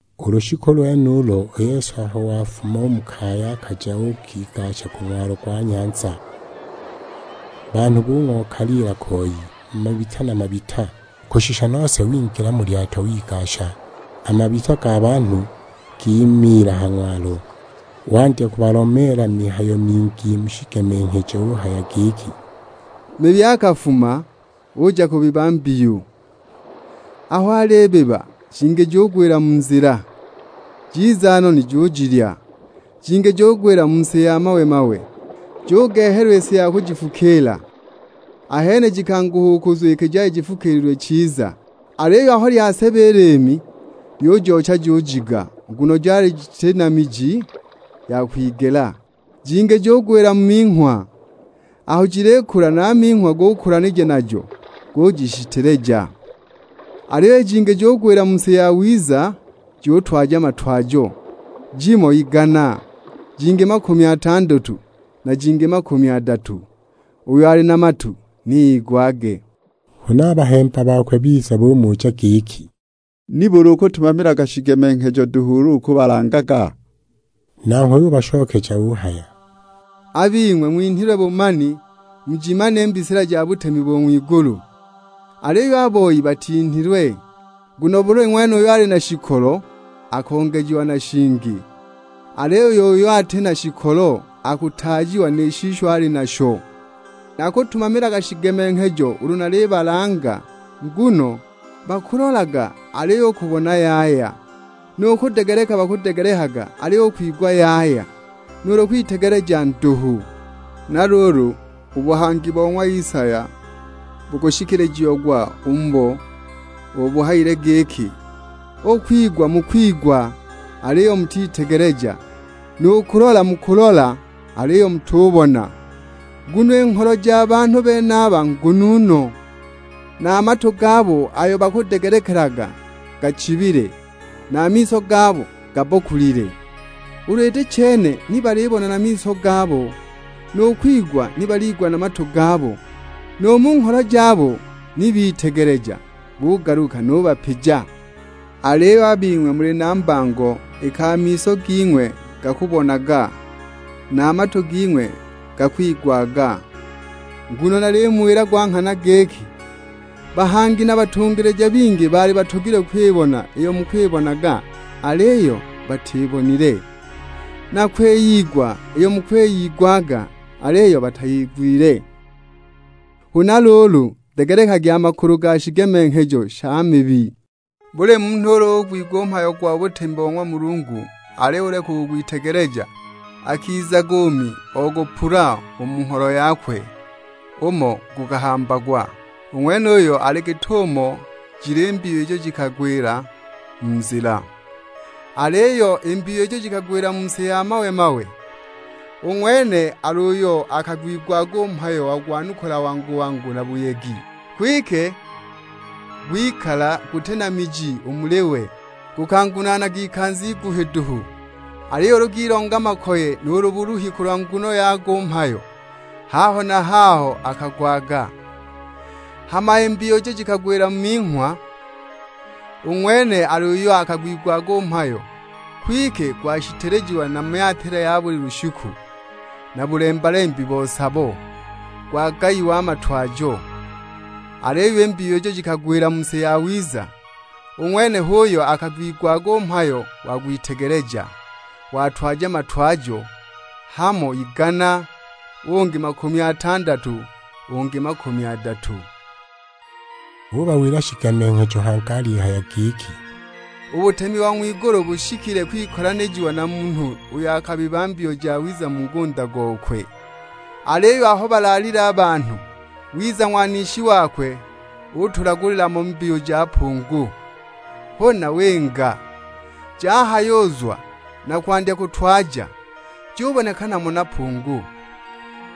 U lushiku lwenulo, u Yesu aho wafuma u mu kaya akaja uukigasha ku ng'walo gwa nyanza. Banhu bung'okaliila koi, mabita na mabita; kushisha nose wingila mu lyato wigasha, a mabita ga banhu gimiila ha ng'walo. Wandya kubalomeela mihayo mingi mu shigemenghejo; uhaya giki, "Mibi akafuma, uja kubiba mbiyu. Aho alibiba, jingi jugwila mu nzila; jiza noni jujilya. Jingi jugwila mu si ya mawe-mawe, jugehelwa i si ya kujifukiila; ahene jikanguha u kuzwa iki jali jitafukiililwe chiza. Aliyo aho lyaseba i liimi, lyujoocha jujiga, nguno jali jiti na miji ya kwigela. Jingi jugwila mu minghwa, aho jilikula na a minghwa gukulanija najo, gujishiteleja. Aliyo jingi jikagwila mu si yawiza jutwaja matwajo: jimo igana, jingi makumi atandatu, na jingi makumi adatu. Uyo ali na matu ni igwage." Huna a bahemba bakwe biza bumuja giki, "Nibuli ukutumamilaga shigemenghejo duhu ulu ukubalangaga?" Nanghwe ubashokeja uhaya, "A bing'we ng'winhilwe bumani, mujimane i mbisila ja butemi bo ng'wigulu; aliyo a boi batinhilwe. Nguno buli ng'wene uyo ali na shikolo, akongejiwa na shingi; aliyo uyo ati na shikolo akutaajiwa ni shisho ali nasho. Nakutumamilaga shigemenghejo ulu nalibalanga, nguno: bakulolaga, aliyo u kubona yaya. Nu kudegeleka bakudegelekaga, aliyo u kwigwa yaya; nuulu kwitegeleja nduhu. Na luulu u buhangi bo ng'wa Isaya bukushikilijiagwa u mubo; ubo buhayile giki, 'U kwigwa mukwigwa, aliyo mutitegeleja; nu kulola mukulola, aliyo mutubona. Nguno i ngholo ja banhu benaba ngunu no, na a matu gabo ayo bakudegelekelaga gachibile; na a miso gabo gabbokulile. Ulu iti chene, ni balibona na miso gabo, nu kwigwa ni baliigwa na matu gabo, nu mu ngholo jabo ni bitegeleja, bugaluka, nubapija!' "Aliyo a bing'we muli na mbango iki a miso ging'we gakubonaga, na a matu ging'we gakwigwaga. Nguno nalimuwila gwa nghana giki, bahangi na batungilija bingi baali batogilwe kwibona iyo mukwibonaga aliyo batibonile; na kwiyigwa iyo mukwiyigwaga aliyo batiyigwile." "Huna luulu, degelekagi a makulu ga shigemenghejo sha mibi. Buli munhu ulu ugwigwa u mhayo gwa butemi bo ng'wa Mulungu aliyo uleka u kugwitegeleja, akizaga u Mi ogupula u mu ngholo yakwe umo gukahambagwa; u ng'wenuyo ali git'umo jili i mbiyu ijo jikagwila mu nzila. Aliyo i mbiyu ijo jikagwila mu si ya mawe-mawe, u ng'wene al'uyo akagwigwaga u mhayo wagwanukula wangu-wangu na buyegi. Kwike gwikala guti na miji u muli we. Gukangunaanaga ikanza iguhi duhu, aliyo ulu gilonga makoye nuulu buluhi kulwa nguno yago u mhayo, haho na haho akagwaga. Hama i mbiyu ijo jikagwila mu minghwa, u ng'wene ali uyo akagwigwaga u mhayo, kwike gwashitelejiwa na myatila ya buli lushiku, na bulemba-lembi bo sabo; gwagaiwa a matwajo! Aliyo i mbiyu ijo jikagwila mu si yawiza, u ng'wene h'uyo akagwigwaga u mhayo wagwitegeleja, watwaja matwajo: hamo igana, ungi makumi atandatu, ungi makumi adatu." Ubawila shigemenghejo hangi alihaya giki, "U butemi bo ng'wigulu bushikile kwikolanijiwa na munhu uyo akabiba mbiyu jawiza mu ngunda gokwe. Aliyo aho balaalile a banhu, wiza ng'wanishi wakwe utulagulila mo mbiyu ja pungu, huna winga! Jahayuzwa na kwandya kutwaja, jubonekana mo na pungu.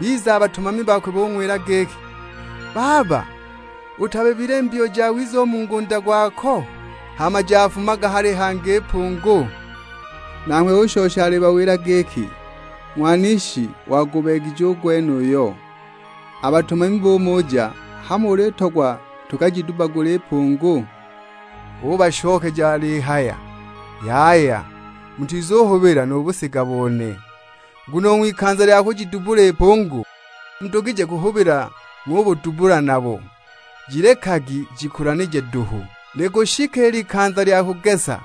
Biza a batumami bakwe bung'wila giki, 'Baba, utabibile mbiyu jawiza u mu ngunda gwako? Hama jafumaga hali hangi i pungu?' Nanghwe ushosha alibawila giki, 'Ng'wanishi wagubeegije u gwenuyo.' A batumami bumuja, 'Hamo ulitogwa tukajidubbagule i pungu?' Ubashokeja alihaya, 'Yaya, mutizubuhubila nu busiga bone. Nguno u ng'wikanza lya kujidubbula i pungu, mudugije kuhubila ng'ubudubbula nabo. Jilekagi jikulanije duhu, likushika i likanza lya kugesa;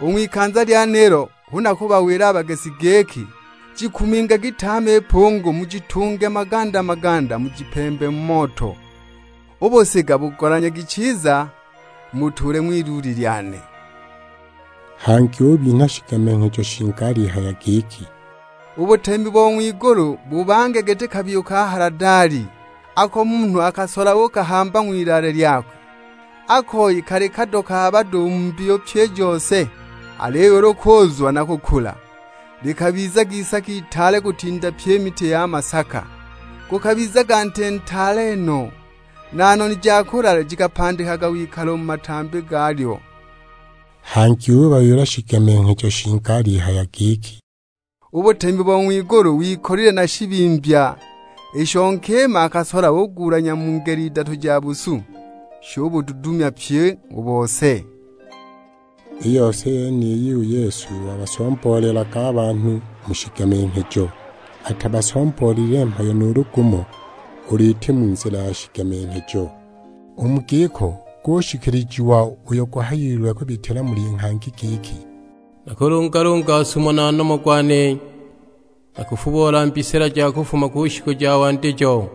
u ng'wikanza lyenilo hu nakubawila a bagesi giki: Jikumingagi tame i pungu mujitunge maganda-maganda mujipembe mu moto. U busiga bugolanyagi chiza mubutuule ng'wiluuli lyane.' " Hangi ubinha shigemenghejo shingi alihaya giki, "U butemi bo ng'wigulu bubange giti kabiyu ka haladali, ako munhu akakasola uukakahamba ng'wilaale lyakwe. A koyi kali kado ka bado u mu mbiyu pyi i jose, aliyo ulu kuuzwa na kukula, likabizaga isaka itaale kutinda pye i miti ya masaka. Gukabizaga nti ntaale no, na noni ja kulala jikapandikaga wikalo u mu matambi galyo." Hangi ubawila shigemenghejo shingi alihaya giki, "U butemi bo ng'wigulu wikolile na shibimbya, isho nkima akasola ugulanya mu ngele idatu ja busu, shubududumya pyi u bose." I yose yeniyi u Yesu wabasomboolelaga a banhu mu shigemenghejo; atabasomboolelile mhayo nuulu gumo, ulu iti mu nzila ya shigemenghejo. U mu giko gushikilijiwa uyo guhayiwe kubitila muli nghangi giki, "Nakulungalunga sumo na nomo gwane, nakufubola mbisila ja kufuma ku shiku ja wandijo."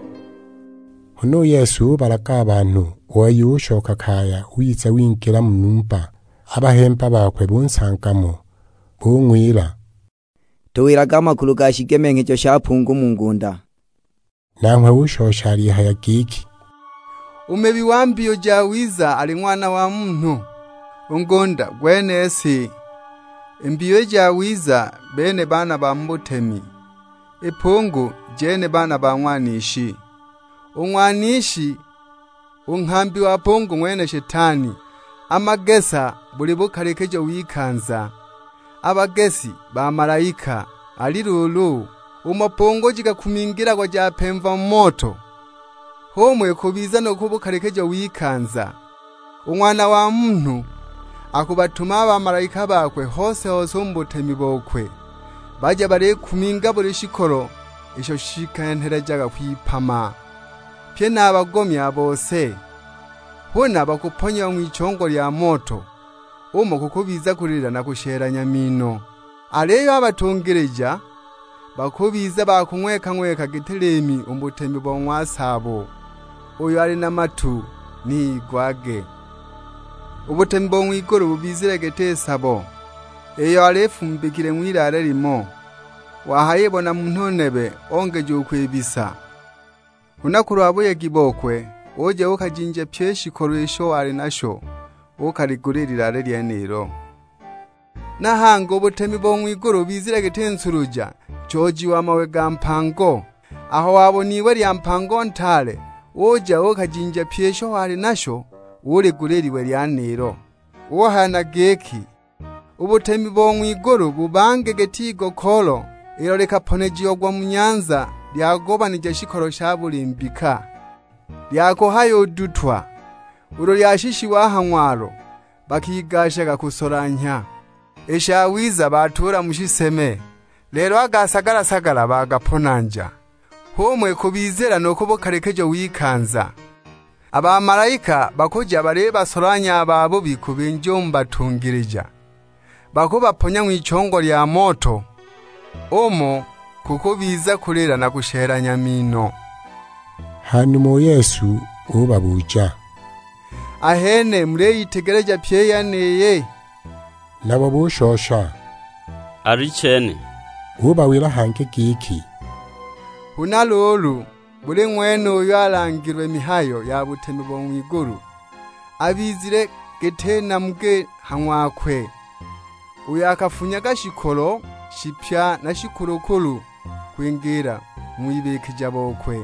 Huna u Yesu ubalaga a banhu, u wei ushoka kaya, wiza wingila mu numba. A bahemba bakwe bunsanga mo; bung'wila, "Tuwilage a makulu ga shigemenghejo sha pungu mu ngunda." Nanghwe ushosha alihaya giki, "U mibi wa mbiyu jawiza ali Ng'wana wa Munhu. U ngunda gwene si, i mbiyu i jawiza bene baana ba mu butemi, i pungu jene baana ba Ng'wanishi. U ng'wanishi, u nghambi wa pungu ng'wene Shetani. A magesa buli bukalikijo w'ikanza, a bagesi bamalaika. Ali luulu, umo pungu jikakumingilagwa japemva mu moto, h'umo ikubizila nu ku bukalikijo w'ikanza. U Ng'wana wa Munhu, akubatuma a bamalaika bakwe hose-hose u mu butemi bokwe, baje balikuminga buli shikolo isho shikenhelejaga kwipama; pye na a bagomi a bose. Huna bakubaponya ng'wichongo lya moto, umo kukubiza kulila na kushelanya mino. Aliyo a batungilija, bakubiza ba kung'weka-ng'weka giti liimi u mu butemi bo ng'wa Saabo. Uyo ali na matu ni igwage." "U butemi bo ng'wigulu bubizile giti sabo, iyo yali yifumbikile ng'wilaale limo, wahayibona munhu nebe ongeja u kwibisa. Huna kulwa buyegi bokwe, uja uukajinja pyi i shikolo isho wali nasho, uukaligula i lilaale lyenilo. Na hangi u butemi bo ng'wigulu bubizile giti nsuluja, nchooji wa mawe ga mpango. Aho wabona iwe lya mpango ntaale, uja uukajinja pyi isho wali nasho, uligula i liwe lyenilo." Uhaya na giki, "U butemi bo ng'wigulu bubange giti igokoolo, ilo likaponejiagwa mu nyanza lyagobanija shikolo sha buli mbika. Lyakuhayudutwa, ulu lyashishiwa a ha ng'walo, bakigashaga kusolanhya. I shawiza batuula mu shiseme, lelo a ga sagala-sagala bagaponanja! H'umo ikubizila nu ku bukalikijo w'ikanza; a bamalaika bakuja balibasolanhya a babubi kubinja u mu batungilija. Bakubaponya ng'wichongo lya moto, umo kukubiza kulila na kushelanya mino!" Hanuma u Yesu ubabuja, "Ahene muliyitegeleja pyi i yeniyi?" Nabo bushosha, "Alichene." Ubawila hangi giki, "Huna luulu, buli ng'wene uyo alangilwe mihayo ya butemi bo ng'wigulu, abizile giti namugi ha ng'wakwe, uyo akafunyaga shikolo shipya na shikulukulu, kwingiila mu wibikija bokwe."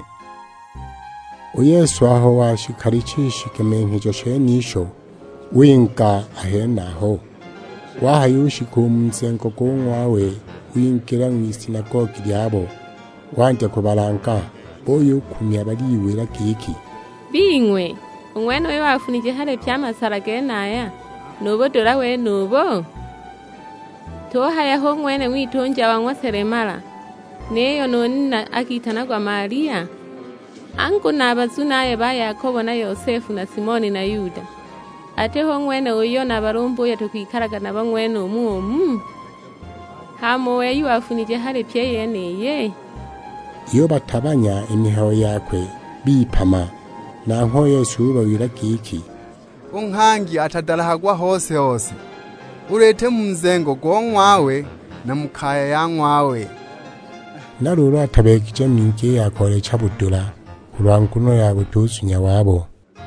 U Yesu aho washikalicha i shigemenghejo shenisho, winga a henaho. Wahayushika u mu nzengo go ng'wawe wingila ng'wisinagogi lyabo, wandya kubalanga. Buyukumya baliwila giki; "Bing'we, u ng'wenuyu wafunije hali pye a masala genaya, nu budula wenubu? Tuhaya hu ng'wene u ng'witunja wa ng'wa selemala, niyo nu nina akitanagwa Malia? Angu na a bazunaye ba Yakobo na Yosefu na Simoni na Yuda! Ati hu ng'wene uyo na balumbuye tukwikalaga nabo ng'wenumu umu? Hama u wei wifunije hali pyi i yeniyi?" Yubatabanya i mihayo yakwe, bipama! Nanghwe U Yesu ubawila giki, "U nghangi atadalahagwa hose-hose, ulu iti mu nzengo go ng'wawe na mu kaya ya ng'wawe." Na luulu atabeegije mingi i ya koolecha budula, kulwa nguno ya butuzunya wabo.